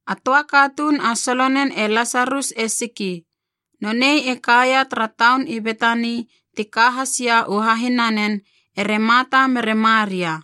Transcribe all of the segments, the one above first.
A töa katuun a solonen e Lasarus e siki. Nonei e kaia tara taun i Betani ti ka has ia u hahinanen ere Marta mere Maria.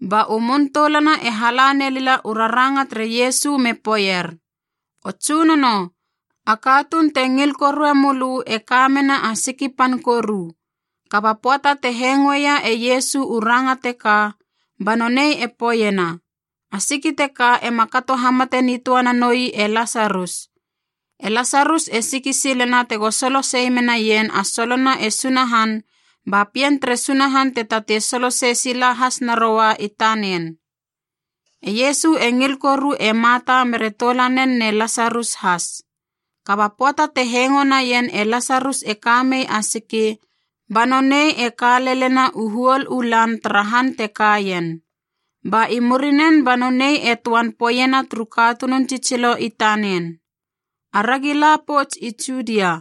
Ba u mun toulana e hala nelila u raranga tere Iesu me poeier, “O Tsunono, a katuun te ngil korue mölö e ka mena a siki pan koru.” Kaba pöata te hengoeia e Iesu u ranga teka, ba nonei e poeiena, “A siki teka ema kato hamate nitöa nanoi e Lasarus. E Lasarus e siki silena tego solo sei menaien a solona e Sunahan ba Pien tere Sunahan te tatei solo sei sila has naroa i tanen.” E Iesu e ngil koru e Marta mere toulanen ne Lasarus has. Kaba pöata te hengo naien e Lasarus e ka mei a siki, ba nonei e ka lelena u huol u lan tara han te kaien. Ba i murinen ba nonei e töan poeiena turu katunun tsitsilo i tanen, “Aragi la pouts i Judia.”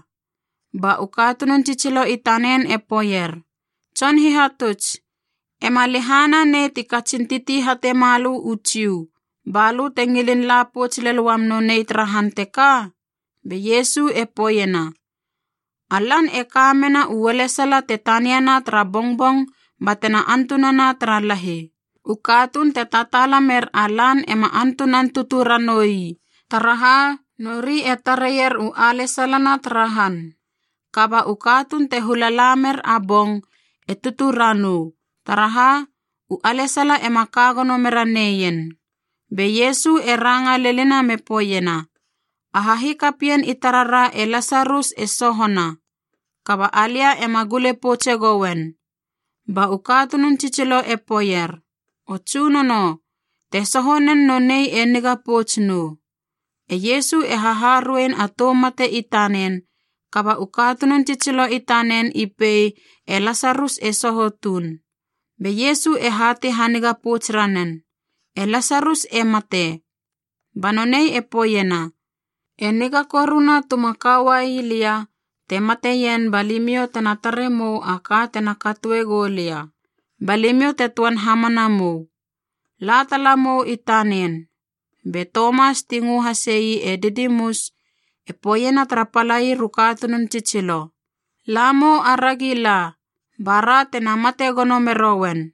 Ba u katunun tsitsilo i tanen e poeier, “Tson Hihatuts, ema lehana nei ti katsin titi hate malö u Jiu, ba lö te ngilin la pouts lel uam nonei tara han teka?” Be Iesu e poeiena, “A lan e ka mena u ualesala te taniana tara bongbong batena antunana tara lahi. U katuun te tataala mer a lan ema antunan tutu ranoui, taraha nori e tareier u alesalana tara han. Kaba u katuun te hula la mer a bong e tutu ranou, taraha u alesala ema ka gono mera neien.” Be Iesu e ranga lenina me poeiena, “A hahikapien i tarara e Lasarus e sohona, kaba alia ena gule poutse goen.” Ba u katunun tsitsilo e poeier, “O Tsunono, te soho nen nonei e niga pouts nou.” E Iesu e haharuein a tou mate i tanen, kaba u katunun tsitsilo i tanen i pei e Lasarus e soho tuun. Be Iesu e hatei haniga pouts ranen, “e Lasarus e mate.” Ba nonei e poeiena, “E niga koruna tuma ka uai lia te mateien ba limiou tena tare mou a ka tena katoe goulia, ba limiou te töan hamana mou. La tala mou i tanen.” Be Tomas ti ngö hasei e Didimus e poeiena tara palair u katunun tsitsilo, “La mou aragi la, bara tena mate gono merouen.”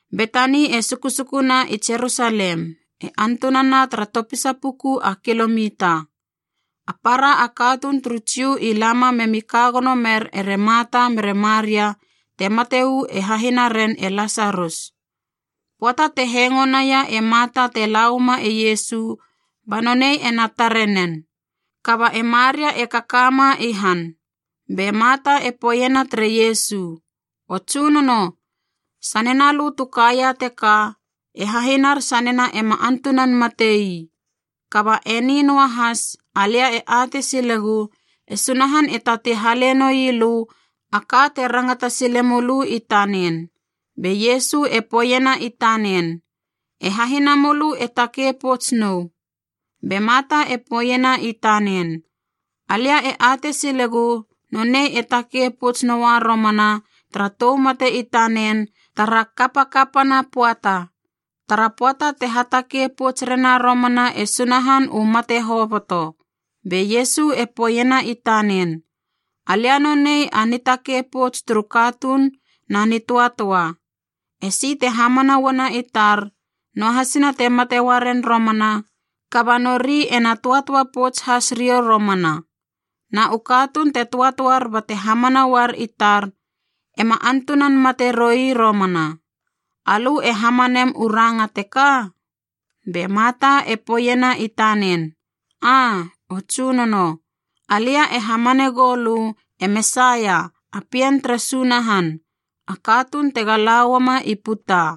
Betani e sukusukuna i Jerusalem, e antunana tara topisa puku a kilomita. A para a katuun turu Jiu i lama memi ka gono mer ere Marta mere Maria te mate uu e hahinaren e Lasarus. Pöata te hengo naia e Marta te lauama e Iesu, ba nonei ena tare nen, kaba e Maria e kaka ma i han. Be Marta e poeiena tere Iesu, “O Tsunono, sanena lö tu kaia teka, e hahinar sanena ema antunan mate ii! Kaba eni noahas alia e atei silegu e Sunahan e tatei hale noi lö a ka te rangata sile mölö i tanen.” Be Iesu e poeiena i tanen, “E hahinamölö e takei pouts nou.” Be Marta e poeiena i tanen, “Alia e atei silegu nonei e takei pouts noa romana tara tou mate i tanen tara kapakapana pöata, tara pöata te hatakei pouts rena romana e Sunahan u mate hoboto.” Be Iesu e poeiena i tanen, “Alia nonei a nitakei pouts turu katuun na nitöatöa. Esi te hamana uana i tar, noahasina te mate uaren romana, kaba nori ena töatöa pouts has riou romana. Na u katuun te töatöar bate hamana uar i tar, ema antunan mate roi romana. Alö e hamanem u ranga teka?” Be Marta e poeiena i tanen, “Aa, o Tsunono. Alia e hamanegou lö e Mesaia, a Pien tere Sunahan, a katuun tega lauama i puta.”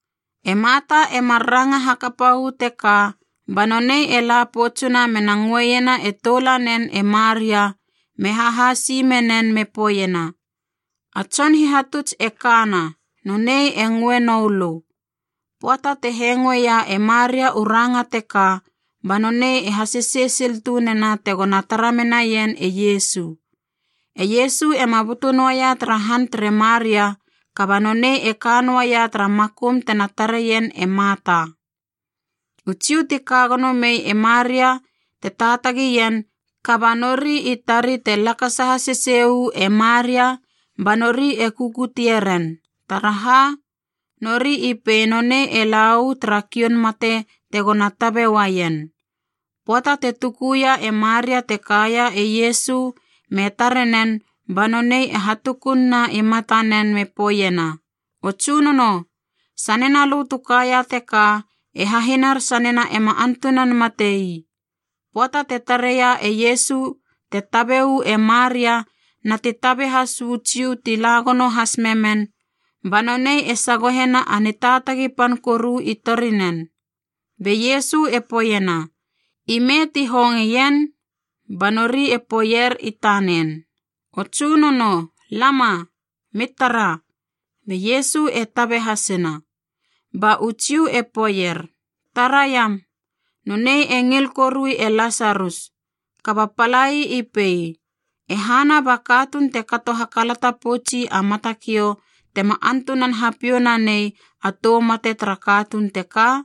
E Marta e mar ranga hakapa uu teka ba nonei e la poutsuna mena ngöena e toulanen e Maria me hahasi menen me poeiena, “A Tson Hihatuts e kana, nonei e ngöe noulö.” Pöata te hengoeia e Maria u ranga teka ba nonei e hasesei sil tunena tegona tara menaien e Iesu. E Iesu ema butu noaia tara han tere Maria kaba nonei e ka noaia tara makum tena tareien e Marta. U Jiu ti ka gono mei e Maria te taatagi ien kaba nori i tari te lakasa hasesei uu e Maria ba nori e kukutie ren, taraha nori i pei nonei e lau tara kioun mate tegona tabe uaien. Pöata te tukuia e Maria te kaia e Iesu me tare nen ba nonei e hatukun na i matanen me poeiena, “O Tsunono, sanena lö tu kaia teka, e hahinar sanena ema antunan mate ii!” Pöata te tareia e Iesu te tabe uu e Maria na ti tabe has uu Jiu ti la gono has memen, ba nonei e sagohena a nitaatagi pan koru i torinen. Be Iesu e poeiena, “Ime ti hongeien?” Ba nori e poeier i tanen, “O Tsunono, lama. Mi tara.” Be Iesu e tabe hasina. Ba u Jiu e poeier, “Taraiam, nonei e ngil korui e Lasarus.” Kaba palai i pei, “E hana ba katuun te kato hakalata poutsi a matakiou tema antunana hapiou nanei a tou mate tara katuun teka?”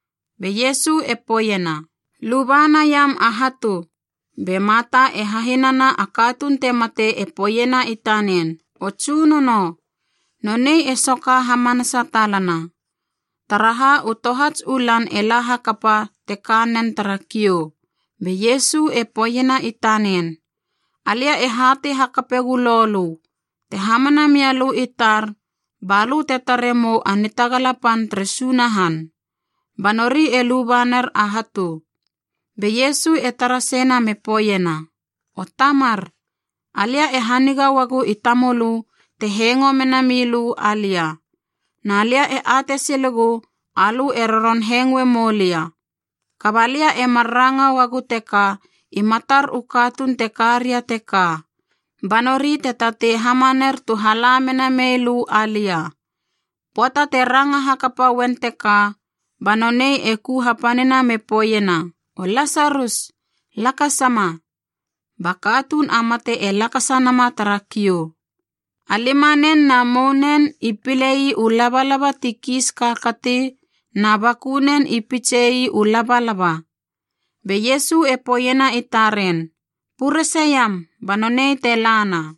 Be Iesu e poeiena, “Luba naiam a hatu!” Be Marta e hahinana a katuun te mate e poeiena i tanen, “O Tsunono, nonei e soka hamanasa talana, taraha u tohats u lan e la hakapa te ka nen tara kiou.” Be Iesu e poeiena i tanen, “Alia e hatei hakape gölo lö, te hamana mia lö i tar, balö te tare mou a nitagala pan tere Sunahan.” Ba nori e luba ner a hatu. Be Iesu e tara seina me poeiena, “O Tamar, alia e haniga uagu i tamölö te hengo mena milö alia. Na lia e atei silegu alö e roron hengoe moulia, kaba lia e mar ranga uagu teka i matar u katuun te ka ria teka, ba nori te tatei hamaner tu hala mena mei lö alia.” Pöata te ranga hakapa uen teka ba nonei e ku hapanina me poeiena, “O Lasarus, lakasama!” Ba katuun a mate e lakasa nama tara kiou. A limanen na mounen i pilei u labalaba ti kiis kaakati na bakunen i pitsei u labalaba. Be Iesu e poeiena i taren, “Purese iam, ba nonei te lana!”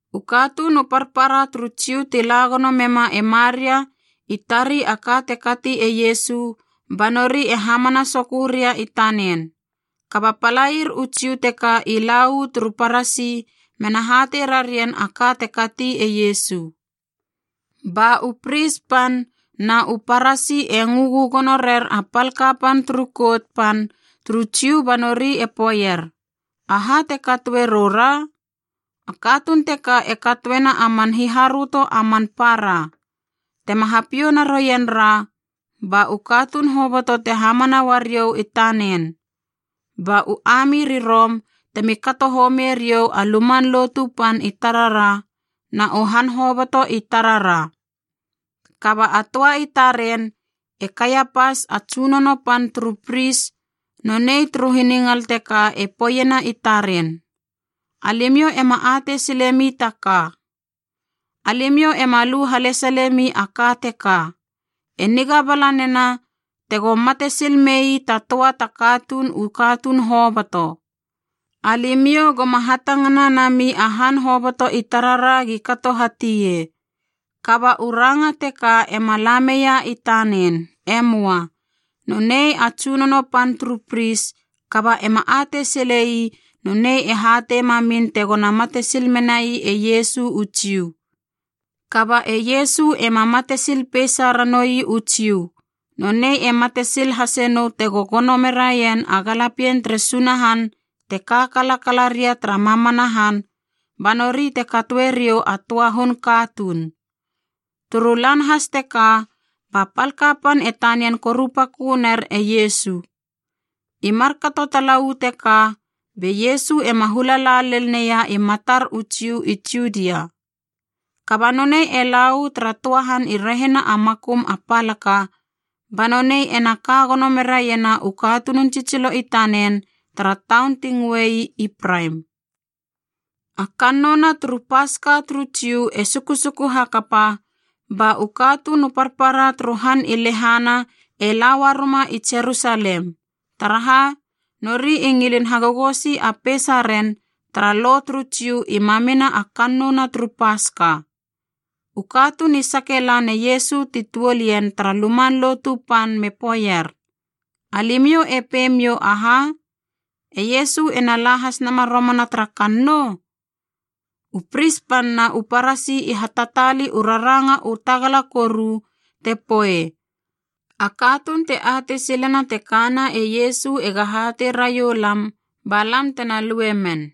U katuun u parpara turu Jiu ti la gono mema e Maria i tari a ka te kati e Iesu, ba nori e hamana soköu ria i tanen. Kaba palair u Jiu teka i la uu turu Parasi mena hatei rarien a ka te kati e Iesu. Ba u Pris pan na u Parasi e ngö gögono rer a pal kapan turu Kout Pan turu Jiu ba nori e poeier, “Aha te katoe rou ra? A katuun teka e katoena a man hiharöto a man para! Tema hapiou naroien ra, ba u katuun hoboto te hamana uariou i tanen. Ba u ami ri Rom temi kato homie riou a Luman Lotu Pan i tarara na u han hoboto i tarara!” Kaba a töa i taren, e Kaiapas a tsunono pan turu pris nonei turu hiningal teka e poeiena i taren, “Alimiou ema atei silemi ta ka! Alimiou ema lu halesale mi a ka teka, e niga bala nena tego mate sil mei ta töa ta katuun u katuun hoboto. Alimiou goma hatangana nami a han hoboto i tarara gi kato tie.” Kaba u ranga teka ema lameia i tanen. E möa. Nonei a tsunono pan turu pris, kaba ema atei silei nonei e hatei mamin tegona mate sil menai e Iesu u Jiu. Kaba e Iesu ema mate sil peisa ranoui u Jiu, nonei e mate sil hase nou tego gono meraien a galapien tere Sunahan te ka kalakala ria tara mamana han ba nori te katoe riou a töa hun katuun. Turu lan has teka ba pal kapan e tanian korupakö ner e Iesu. I markato tala uu teka, be Iesu ema hula la lel neia i matar u Jiu i Judia. Kaba nonei e la uu tara töa han i rehina a makum a palaka, ba nonei ena ka gono meraiena u katunun tsitsilo i tanen tara taun ti ngöei Ipraim. A kannouna turu Paska turu Jiu e sukusuku hakapa, ba u katuun u parpara turu han i lehana e la uaruma i Jerusalem. Taraha, nori i ngilin hagogosi a peisaren tara Lo turu Jiu i mamima a kannouna turu Paska. U katuun i sake lan e Iesu ti tuol ien tara Luman Lotu Pan me poeier, “Alimiou e pei miou aha? E Iesu ena la has nama romana tara kannou?” U Pris pan na u Parasi i hatataali u raranga u tagala koru te poei, “A katuun te atei silena te kana e Iesu ega hatei railam ba lam tena lue men.”